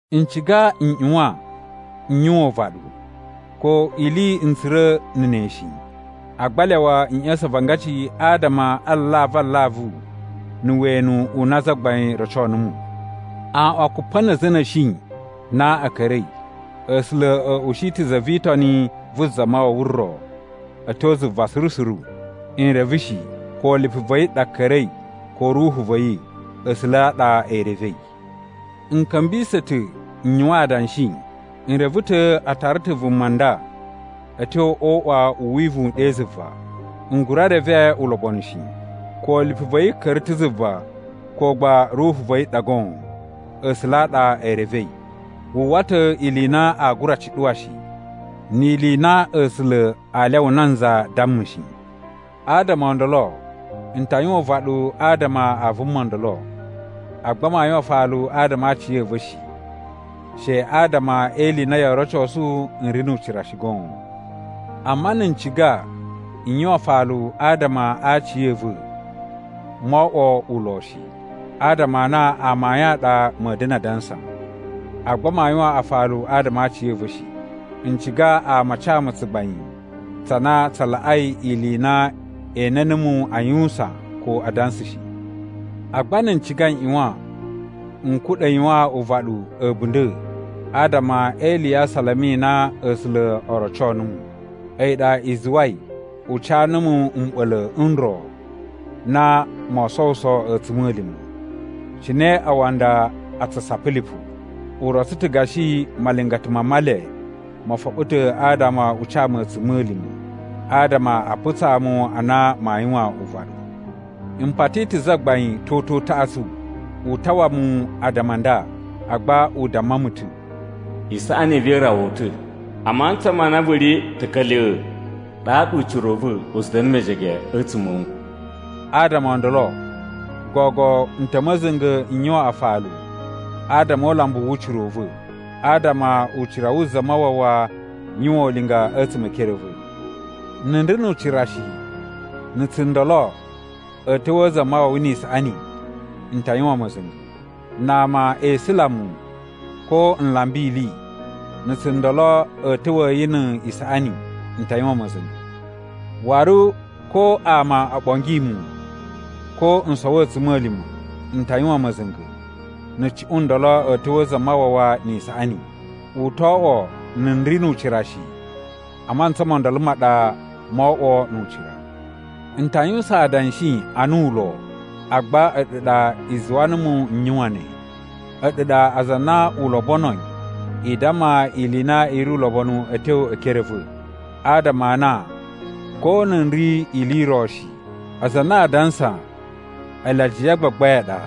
N ciga n ꞌyuwan n yuwan uvaɗu. Ko ili n tsura̱ na̱ ne shi, agba lyawa n ꞌya̱sa̱n avangaci adama a alavu alavu na̱ wenu u na Zagbain roco numu. Aꞌwan kupa na̱ a̱za̱ a̱ na̱shi na a̱ ka̱ra̱i, A̱sula̱ a̱ ushi ta̱ za vi Itoni vu Zamawawa ro a̱ tyo zuva suru suru. N reve shi ko lipu va̱ yi ɗa ka̱ra̱i, ko ruhu va̱ yi, A̱sula̱ a ɗa e revei. N ka̱mbisa̱ ta̱ n yuwan adanshi, n reve ta̱ a tara ta̱ vuma nda a̱ tyo o uꞌwa u wivuwun ɗe zuva, n gura reve ulobonu shi, ko lipu va̱ yi ka̱ra̱ ta̱ zuva ko gba ruhu va̱ yi ɗa goon, A̱sula̱ a ɗa e revei. Wu uwwa ta̱ ili i na aa gura cuɗuwa shi, ni ili i na A̱sula̱ aa lyawa nanza damma shi. Adama o ndolo n ta yuwan uvaɗu adama a vuma ndolo, agba maa yuwan afalu adama a aciya̱va̱ shi, she adama e ili i na yoo rocosu n ri nu ucira shi goon. Amma na̱ n ciga n yuwan afalu adama a aciya̱va̱, moo oꞌwo ulo shi, adama a na amayun a ɗa ma̱a̱ da̱na̱ a dansa. Agba maa yuwan afalu adama a aciya̱va̱ shi. N ciga ama a ca mu tsugbain tsa na tsa laꞌai ili i na e ene numu a yuwusan ko a dansa shi. Agba na̱ n ciga n ꞌyuwan n kuɗa̱ yuwan uvaɗu a̱bunda̱ adama e ili ya asalama i na A̱sula̱ o roco numu. A̱yi ɗa i zuwai u ca numu mɓa̱la̱ n ro na moo sowuso a̱tsuma̱lima̱, cine aawanda a tsu sapa lipu. U rotso ta̱ gashi malingata ma Male mo foɓo ta̱ adama u ca mu a̱tsuma̱lima̱ adama a putsaa mu a na maa yuwan uvaɗu. M pati ta̱ Zagbain toto utaꞌatsu u tawa mu addama a nda. Agba u damma mu ta̱, “Isaꞌani i va̱ i rawa wu ta̱. A mantsa ma na vu ri ta̱ka̱lya̱, ɗaɗa ucira u va̱ u tsu da̱na̱ mejege a̱tsuma̱ a̱ wu.” Adama o ndolo gogo n ta̱ ma̱za̱nga̱ n yuwan afalu adama o ulambu wu ucira u va̱, adama ucira wu Zamawawa yuwan ulinga a̱tsuma̱ e ekere a̱ va̱. Na̱ n ri nu ucira shi, na̱ tsundolo a̱a̱ ta̱wa̱a̱ Zamawawa ni isaꞌani, n ta yuwan ma̱za̱nga̱. Na ama e isula mu, ko n lamba ili, na̱ tsundolo a̱ ta̱wa̱a̱ yi ni isaꞌani, n ta yuwan ma̱za̱nga̱. Waru ko ama o ɓongi mu ko n sowo a̱tsuma̱lima̱, n ta yuwan ma̱za̱nga̱ na̱ cuꞌun ndolo a̱ ta̱wa̱a̱ Zamawawa ni isaꞌani. U to oꞌwo na̱ n ri nu ucira shi, a mantsa mo ndolo ma ɗa moo oꞌwo nu ucira. N ta yuwusan adanshi ana ulo, agba a̱ɗu ɗa i zuwa numu n yuwain ne. A̱ɗu ɗa aza a na u lobonoi i damma ili i na i ri ulobonu a̱ tyo e ekere a̱ va̱. Adama a na ko na̱ n ri ili i ro shi, aza a na a dansa ele “ajiya a gbagbain” a ɗa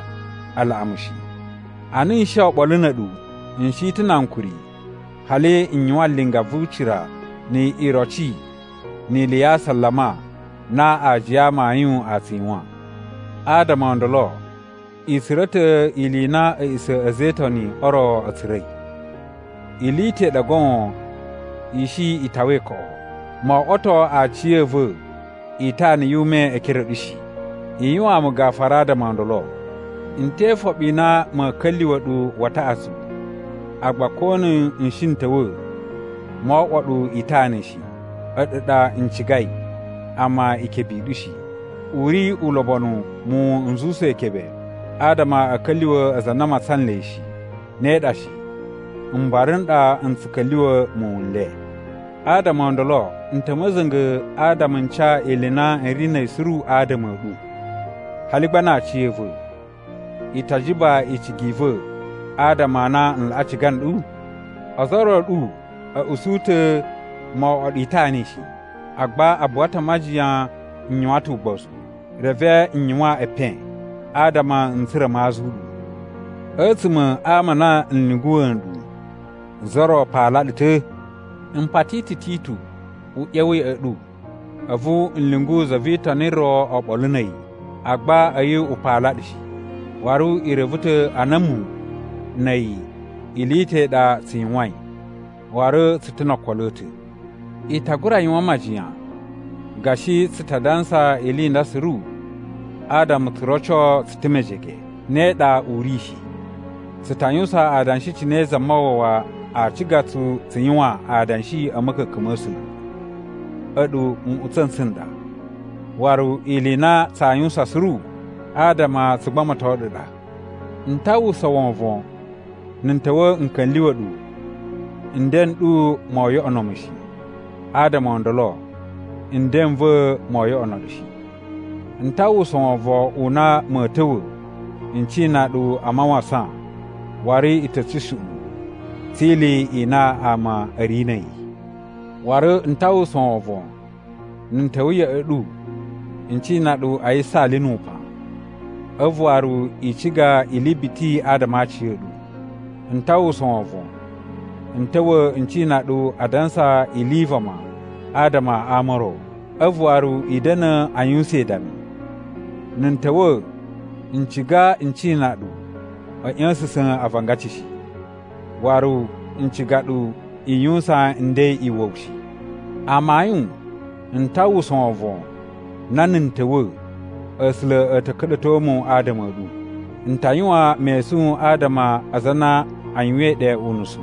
a laꞌa mu shi. Ana n shi oɓolo na̱ a̱ɗu, n shi ta̱ na ankuri hali n yuwan linga vu ucira ni iroci ni ili ya asalama na aajiya a amayun a tsu yuwan. Adama o ndolo i tsura̱ ta̱ ili i na a̱ꞌisa̱ a̱ a̱za̱ e Itoni o ro a̱ tsura̱i. Ili i ta̱ i ɗa goon i shi i tawai koꞌo: mo oꞌwoto aciya̱va̱ itana yu ume e ekere a̱ ɗu shi. I yuwaan mu gafura adama o ndolo! N te ifoɓi i na ma̱a̱ ka̱lyuwa̱ ɗu wa taꞌatsu. Agba ko na̱ n shi n ta̱wa̱ moo oꞌwo ɗu itana shi. A̱ɗu ɗa n cigai, amma ikebe i ɗu shi. U ri ulobonu muwun n zuwusa ikebe adama a̱ ka̱lyuwa̱ aza a na a matsan nle shi. Ne ɗa shi! Mbara n ɗa n tsu ka̱lyuwa̱ muwun n le. Adama o ndolo n ta̱ ma̱za̱nga̱ adama n ca ili i na n ri na̱ a̱yi suru adama a̱ ɗu, hali gba na aciya̱va̱. I ta jiba icigi i va̱ adama a na n laꞌa ciga nɗu? Ozo o ro a̱ ɗu a̱ usu ta̱ mo oꞌwo ɗu itana shi. Agba a buwa ta̱ a majiyan n yuwan ta̱ ugbozu, reve n yuwan epen adama n tsura̱ maa azu ɗu. A̱tsuma̱ a ama a na n lyunguwa̱ nɗu, za ro paala ɗu ta̱? M pati ta̱ Titu u ꞌya̱wa̱ ya̱ꞌa̱ ɗu, a̱vu n lyungu za vi Itoni ro oɓolo na̱ a̱yi. Agba a̱yi u paala ɗu shi. Waru i reve ta̱ a na a̱mu na̱ a̱yi ili i ta̱ i ɗa tsu yuwain, waru tsu ta̱ no okolo a̱ ta̱. I ta gura yuwan majiyan gashi tsu ta dansa ili i nda suru adama tsu roco tsu ta̱ mejege. Ne ɗa u ri shi. Tsu ta yuwusan adanshi cine Zamawawa aa ciga tsu tsu yuwan adanshi a̱ ma̱ka̱ka̱n ma̱ A̱sula̱. A̱ɗu nꞌutsa̱ n tsu n ɗa, waru ili i na tsaa yuwusan suru adama tsu gbamato ɗu ɗa. N ta uwwusa wovon na̱ n ta̱wa̱ n ka̱lyuwa̱ ɗu, nden n ɗu moo yoꞌono mu shi, adama o ndolo, nden n va̱ moo yoꞌono ɗu shi. N ta uwwusa wovon u na ma̱a̱ ta̱wa̱ n cina ɗu a mawasan waru i ta̱ tsushuꞌun tsi ili i na ama a̱ ri na̱ a̱yi. Waru n ta uwwusa wovon na̱ n ta̱wa̱ ya̱ꞌa̱ ɗu n cina ɗu a yisaali nu upan, a̱vu waru i ciga ili biti adama a aciya̱ɗu. N ta uwwusa wovon n ta̱wa̱ n cina ɗu a dansa ili i vama adama a ama o ro, a̱vu waru i da̱na̱ a yuwusan idami. Na̱ n ta̱wa̱ n ciga n cina ɗu a̱ ꞌya̱sa̱sa̱n avangaci shi, waru n ciga ɗu i yuwusan nden iwa̱wu shi. Amayun, n ta uwwusa wovon na na̱ n ta̱wa̱, A̱sula̱ a̱ ta̱ ka̱ɗa̱to mu adama a̱ ɗu. N ta yuwan mesun adama a aza a na a yuwain ɗe unusu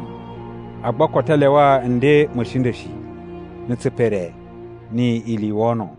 agba koto a lyawa nden ma̱ a̱shinda̱ shi, na̱ tsipere, ni ili i wono.